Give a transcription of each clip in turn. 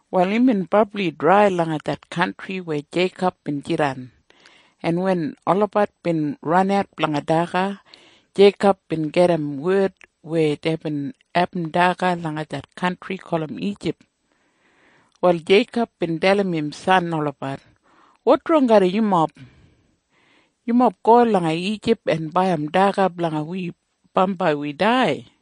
Wal imbin brabli drai langa det kantri weya Jeikob bin jidan, en wen olabat bin ranat blanga daga, Jeikob bin gedim wed weya deibin abum daga langa det kantri gulum Ijip. Wal Jeikob bin dalim im san olabat, “Wotrong garram yumob? Yumob go langa Ijip en baiyim daga blanga wi bambai wi dai.”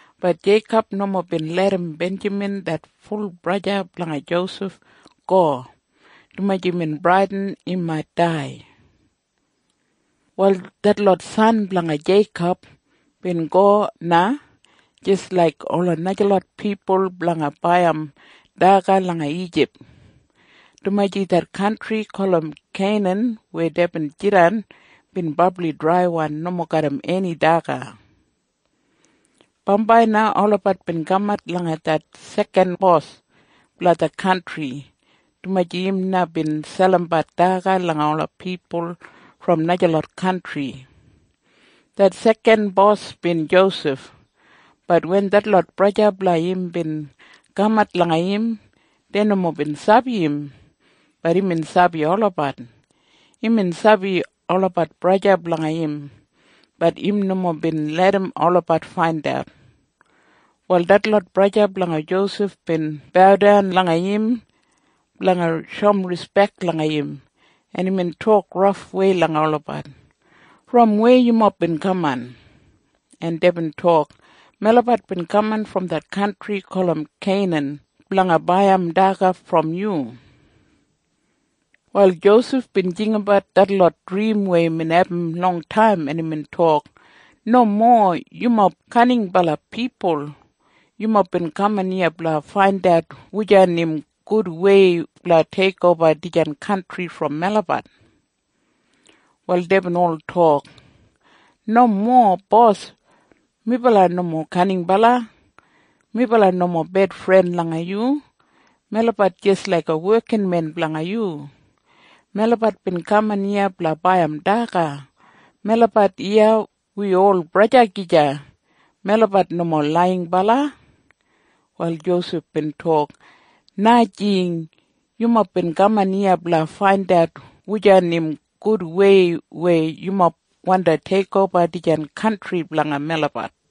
Bat Jeikob nomo bin larram Benjamin det ful braja blanga Josef go, dumaji imbin bradin im mait dai. Wal detlot san blanga Jeikob bin go na jis laik ola najalot pipul blanga baiyim daga langa Ijip, dumaji det kantri gulum Keinan weya deibin jidan bin brabli draiwan nomo garram eni daga. Bambai na olabat bin kamat langa det sekanbos blanga det kantri, dumaji im na bin selimbat daga langa ola pipul brom najalot kantri. Det sekanbos bin Josef. Bat wen detlot braja blanga im bin kamat langa im, dei nomo bin sabi im. Bat imbin sabi olabat. Imbin sabi olabat braja blanga im. Bat im nomo bin larram olabat faindat. Wal detlot braja blanga Josef bin baudan langa im blanga shoum rispek langa im, en imbin tok rafwei langa olabat, “Brom weya yumob bin kaman?” En deibin tok, “Melabat bin kaman brom det kantri gulum Keinan blanga baiyim daga brom yu.” Wal Josef bin jinggabat detlot drim weya imbin abum longtaim, en imbin tok, “Nomo! Yumob kaninbala pipul. Yumob bin kaman iya blanga faindat wujan im gudwei blanga teikoba dijan kantri brom melabat.” Wal deibin ol tok, “Nomo, bos! Melabat nomo kaninbala. Melabat nomo bedfren langa yu. Melabat jis laiga wekinmen blanga yu. Melabat bin kaman iya blanga baiyim daga. Melabat iya wi ol braja gija. Melabat nomo laiyinbala.” Wal Josef bin tok, “Najing! Yumob bin kaman iya blanga faindat wujan im gudwei weya yumob wandi teikoba dijan kantri blanga melabat.”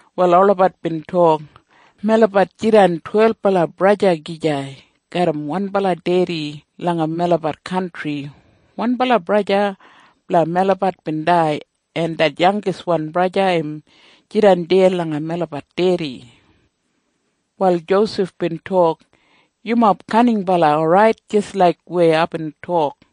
Wal olabat bin tok, “Melabat jidan twelbala braja gija garram wanbala dedi langa melabat kantri. Wanbala braja blanga melabat bin dai, en det yangiswan braja im jidan deya langa melabat dedi.” Wal Josef bin tok, “Yumob kaninbala orait jis laik weya aibin tok.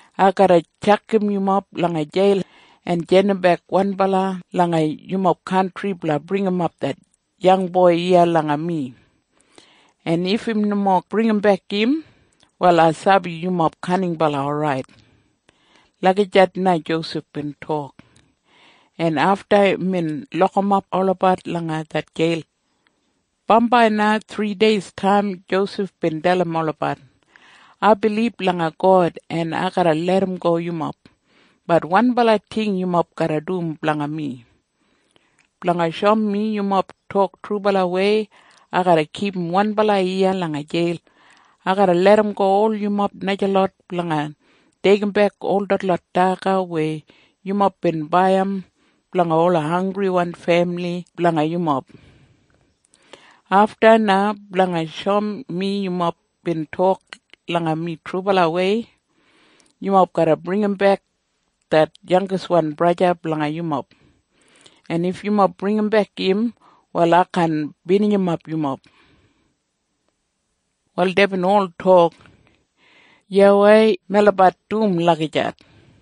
Ai garra tjakam yumob langa jeil en jandimbek wanbala langa yumob kantri blanga bringimap det yangboi iya langa mi. En if im nomo bringimbek im, wal ai sabi yumob kaninbala orait.” Lagijat na Josef bin tok, en afta imbin lokimap olabat langa det jeil. Bambai na thrideistaim Josef bin dalim olabat, “Ai bilib langa God, en ai garra larramgo yumob. Bat wanbala ting yumob garra dum blanga mi. Blanga shoum mi yumob tok trubalawei, ai garra kipum wanbala iya langa jeil. Ai garra larramgo ol yumob najalot blanga deigimbek ol detlot daga weya yumob bin baiyim blanga ola hanggriwan femili blanga yumob. Afta na, blanga shoum mi yumob bin tok langa mi trubalawei, yumob garra bringimbek det yangiswan braja blanga yumob. En if yumob bringimbek im, wal ai kaan binijimap yumob.” Wal deibin ol tok, “Yuwai. Melabat dum lagijat.”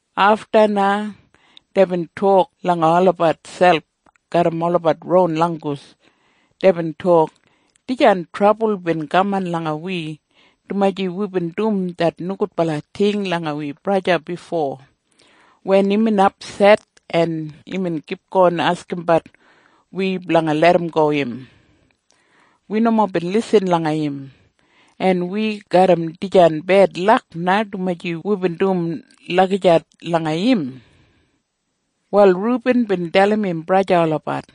Afta na deibin tok langa olabat selp garram olabat ron langgus. Deibin tok, “Dijan trabul bin kaman langa wi dumaji wibin dum det nogudbala ting langa wi braja bifo. Wen imbin apset en imbin kipgon askimbat wi blanga larramgo im, wi nomo bin lisin langa im. En wi garram dijan bedlak na dumaji wibin dum lagijat langa im.” Wal Rubin bin dalim im braja olabat,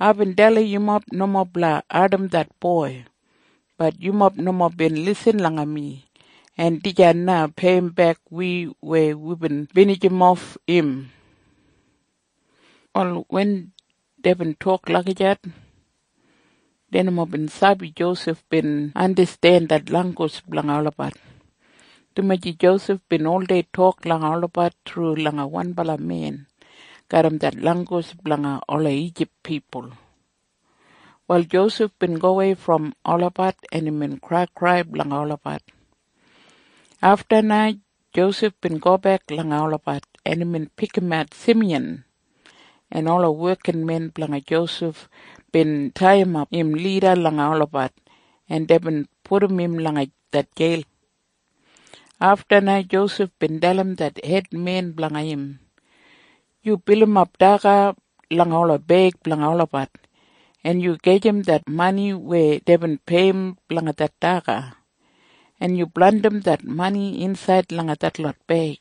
“Aibin dalim yumob nomo blanga ardim det boi. Bat yumob nomo bin lisin langa mi. En dijan na peiyimbek wi weya wibin binijimof im.” Wal wen deibin tok lagijat, dei nomo bin sabi Josef bin andasten det langgus blanga olabat, dumaji Josef bin oldei tok langa olabat thru langa wanbala men garram det langgus blanga ola Ijip pipul. Wal Josef bin gowei brom olabat, en imbin kraikrai blanga olabat. Afta na Josef bin gobek langa olabat, en imbin pikimat Simiyan, en ola wekinmen blanga Josef bin taiyimap im lida langa olabat, en deibin pudum im langa det jeil. Afta na Josef bin dalim det hedmen blanga im, “Yu bilimap daga langa ola beig blanga olabat, en yu gajim det mani weya deibin peiyim blanga det daga, en yu blandim det mani insaid langa detlot beig.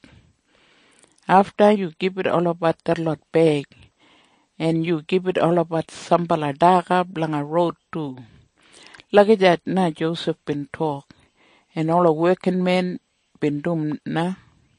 Afta yu gibit olabat detlot beig, en yu gibit olabat sambala daga blanga roud du.” Lagijat na Josef bin tok, en ola wekinmen bin dum na.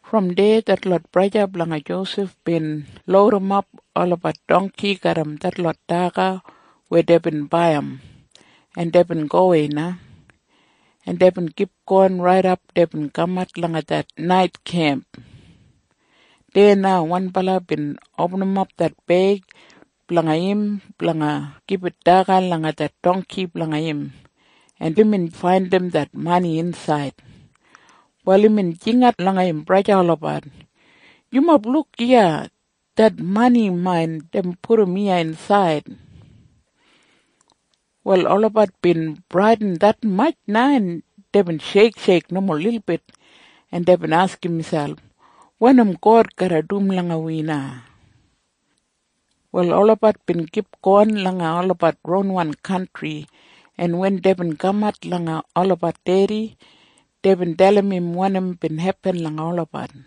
Brom deya detlot braja blanga Josef bin loudimap olabat dongki garram detlot daga weya deibin baiyim, en deibin gowei na, en deibin kipgon raidap deibin kamat langa det nait kemp. Deya na wanbala bin opinim det beig blanga im blanga gibit daga langa det dongki blanga im, en imbin faindim det mani insaid. Wal imbin jingat langa im braja olabat, “Yumob luk iya! Det mani main deibin pudum iya insaid!” Wal olabat bin bradin detmatj na, en deibin sheiksheik nomo lilbit, en deibin askim miselp, “Wanim God garra dum langa wi na?” Wal olabat bin kipgon langa olabat ronwan kantri, en wen deibin kamat langa olabat dedi, deibin dalim im wanim bin hepin langa olabat.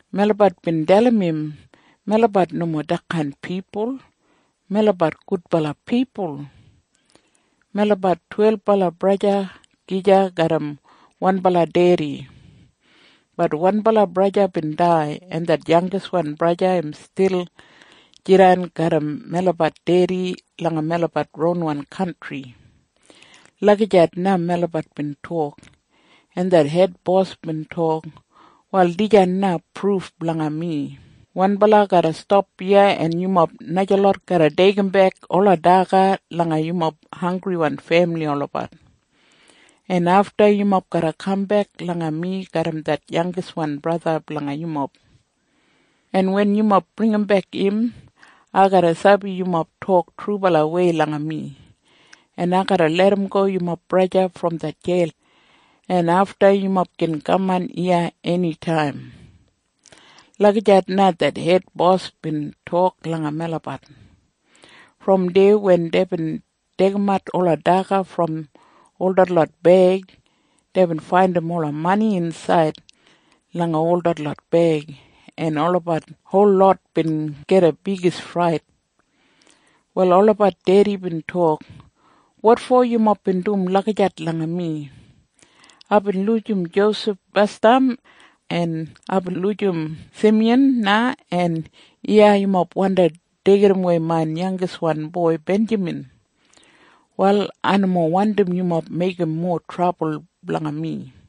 Melabat bin dalim im, ‘Melabat nomo detkain pipul. Melabat gudbala pipul. Melabat twelbala braja gija garram wanbala dedi. Bat wanbala braja bin dai, en det yangiswan braja im stil jidan garram melabat dedi langa melabat ronwan kantri.’ Lagijat na melabat bin tok. En det hedbos bin tok, ‘Wal dijan na pruf blanga mi. Wanbala garra stap iya, en yumob najalot garra deigimbek ola daga langa yumob hanggriwan femili olabat, en afta yumob garra kambek langa mi garram det yangiswan braja blanga yumob. En wen yumob bringimbek im, ai garra sabi yumob bin tok trubalawei langa mi, en ai garra larramgo yumob braja brom det jeil, en afta yumob gin kaman iya enitaim.’ Lagijat na det hedbos bin tok langa melabat.” Brom deya wen deibin deigimat ola daga brom ol detlot beig, deibin faindim ola mani insaid langa ol detlot beig, en olabat holot bin gida bigis frait. Wal olabat dedi bin tok, “Wotfo yumob bin dum lagijat langa mi? Aibin lujim Josef basdam, en aibin lujim Simiyan na, en iya yumob wandi deigidawei main yangiswan boi Benjamin. Wal ai nomo wandim yumob meigim mowa trabul blanga mi!”